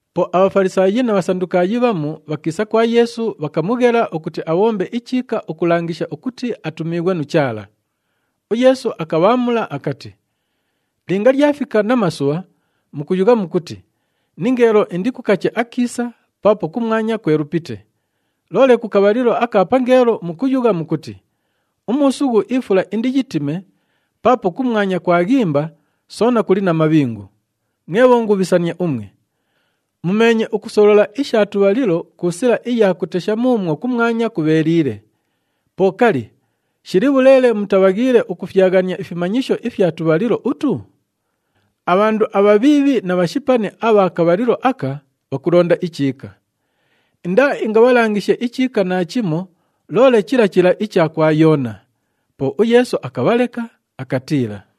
Po aBhafalisaayi na Bhasandukaayi bhamu bhakiisa kwa Yeesu, bhakamughela ukuti abhombe ichiika ukulangisha ukuti atumiighwe nu Chaala. UYeesu akabhaamula akati, “[Linga lyafika namasubha, mukuyugha mukuti, ‘Ningeelo indikukache akiisa paapo kumwanya kwelupite.’ Loole ku kabhalilo aka pangeelo mukuyugha mukuti, ‘Umuusughu ifula indiyitime paapo kumwanya kwaghimba soona kuli na mabhingu.’ Mwe bhongubhisania umwe! Mumeenye ukusolola isha tubhalilo ku sila iya kutesha muumwo kumwanya kubheeliile. Po kali, shili bhuleele mutabhaghiile ukufyaghania ifimanyisho ifya tubhalilo utu?] Abhandu abhabhiibhi na bhashipani abha kabhalilo aka bhakulonda ichiika. Indaaingabhalangishe ichiika naachimo, loole chila chila icha kwa Yoona.” Po uYeesu akabhaleka, akatiila.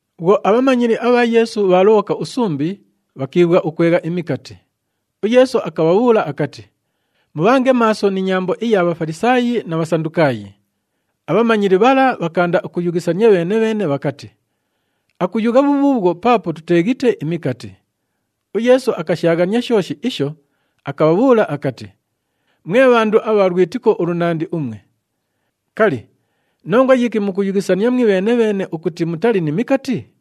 Bhwo abhamanyili abha Yeesu bhaalobhoka usumbi, bhakiibhwa ukwegha imikati. UYeesu akabhabhuula akati, “Mubhange maaso ni nyambo iya Bhafalisaayi na Bhasandukaayi.” Abhamanyili bhala bhakaanda ukuyughisania bheene-bheene bhakati, “Akuyugha bhubhuubhwo paapo tuteeghite imikati.” UYeesu akashaaghania shooshi isho, akabhabhuula akati, “Mwe bhandu abha lwitiko ulunandi umwe! Kali, nongwa yiki mukuyughisania mwibheene-bheene ukuti mutali ni mikati?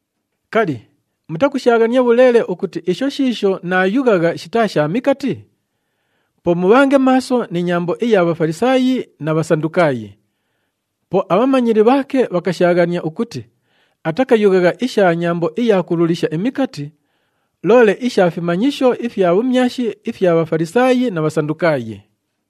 Kali, mutakushaaghania bhuleele ukuti isho shiisho naayughagha shitaa sha mikati? Po mubhange maaso ni nyambo iya Bhafalisaayi na Bhasandukaayi.” Po abhamanyili bhaake bhakashaaghania ukuti atakayughagha isha nyambo iya kululisha imikati, loole isha fimanyisho ifya bhumyashi ifya Bhafalisaayi na Bhasandukaayi.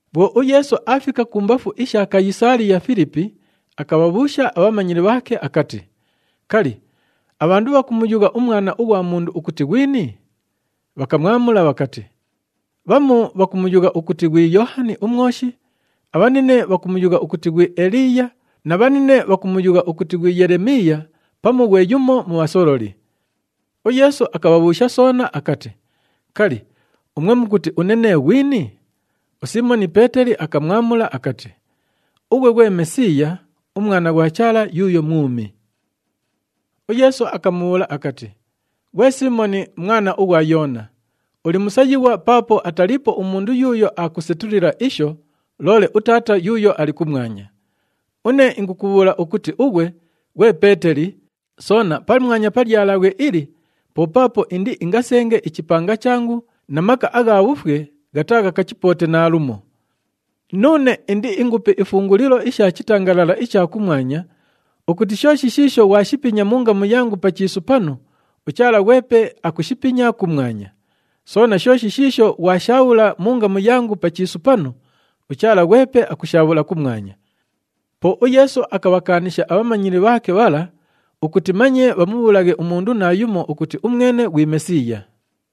Bhwo uYeesu aafika kumbafu isha Kayisaaliya-Filipi, akabhabhuusha abhamanyili bhaake akati, “Kali, abhandu bhakumuyugha uMwana ughwa Mundu ukuti ghwini?” Bhakamwamula bhakati, “Bhamu bhakumuyugha ukuti ghwi Yoohani uMwoshi, abhanine bhakumuyugha ukuti ghwi Eliiya na bhanine bhakumuyugha ukuti ghwi Yelemiiya pamu ghwe yumo mu bhasololi.” UYeesu akabhabhuusha soona akati, “Kali, umwe mukuti une nee ghwini?” USiimoni Peeteli akamwamula akati, “Ughwe ghwe Mesiiya, uMwana ghwa Chaala yuuyo mwumi.” UYeesu akamubhuula akati, “Ghwe Siimoni, mwana ughwa Yoona, uli musayighwa paapo ataliipo umundu yuuyo aakusetulila isho, loole uTaata yuuyo ali kumwanya. Une ingukubhuula ukuti ughwe, ghwe Peeteli, soona pamwanya pa lyalabhwe ili po paapo indiingasenge ichipanga changu na maka agha bhufwe ghataaghakachipoote naalumo. Nuune indiingupe ifungulilo isha chitangalala icha kumwanya ukuti shooshi shiisho ghwashipinya mu ngamu yangu pa chiisu panu, uChaala ghwepe akushipinya kumwanya. Soona shooshi shiisho ghwashaabhula mu ngamu yangu pa chiisu panu, uChaala ghwepe akushaabhula kumwanya.” Po uYeesu akabhakaanisha abhamanyili bhaake bhala ukuti manye bhamubhuulaghe umundu naayumo ukuti umwene ghwi Mesiiya.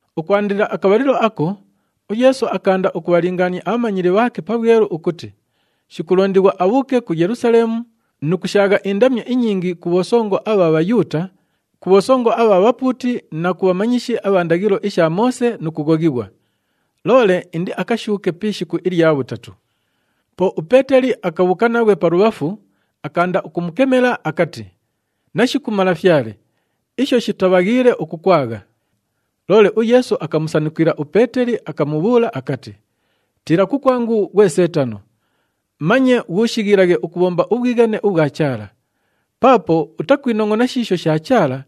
Ukwandila akabhalilo ako, uYeesu akaanda ukubhalingaania abhamanyili bhaake pabhwelu ukuti shikulondighwa abhuuke ku Yelusaleemu nu kushaagha indamyo inyingi ku bhosongo abha Bhayuuta, ku bhosongo abha bhapuuti na ku bhamanyishi abha ndaghilo isha Moose nu kughoghighwa. Loole indiakashuuke pi ishiku ilya bhutatu. Po uPeeteli akabhuuka naghwe palubhafu, akaanda ukumukemela akati, “Nashiku Malafyale, isho shitabhaghiile ukukwagha.” Loole uYeesu akamusanukila uPeeteli, akamubhuula akati, “Tiila kukwangu ghwe Seetano! Manye ghuushighilaghe ukubhomba ubhwighane ubhwa Chaala. Paapo utakwinongʼona shiisho sha Chaala,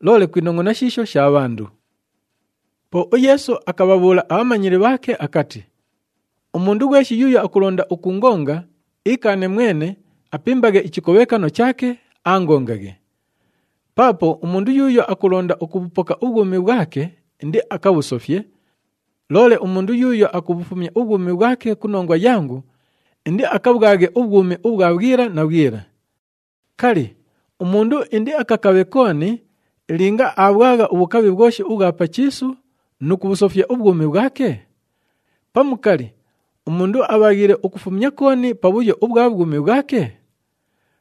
loole kwinongʼona shiisho sha bhandu.” Po uYeesu akabhabhuula abhamanyili bhaake akati, “Umundu ghweshi yuuyo akulonda ukuungonga, iikaane mwene, apimbaghe ichikobhekano chaake, aangongaghe. Paapo umundu yuuyo akulonda ukubhupoka ubhwumi bhwake, indiakabhusofye. Loole umundu yuuyo akubhufumya ubhwumi bhwake ku nongwa yangu, indiakabhwaghe ubhwumi ubhwa bhwila na bhwila. Kali, umundu indiakakabhe kooni linga aabhwagha ubhukabhi bhwoshi ubhwa pa chiisu nu kubhusofya ubhwumi bhwake? Pamu kali, umundu abhaghiile ukufumya kooni pa bhuyo ubhwa bhwumi bhwake?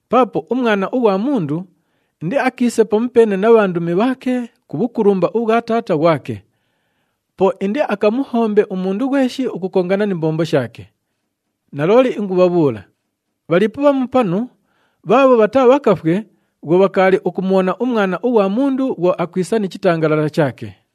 Paapo uMwana ughwa Mundu indiakiise pamupeene na bhandumi bhaake ku bhukulumba ubhwa Taata ghwake. Po indiakamuhombe umundu ghweshi ukukongana ni mbombo shaake. Nalooli ingubhabhuula, bhaliipo bhamu panu bhaabho bhataabhakafwe bhwo bhakaali ukumubhona uMwana ughwa Mundu bhwo akwisa ni chitangalala chaake.”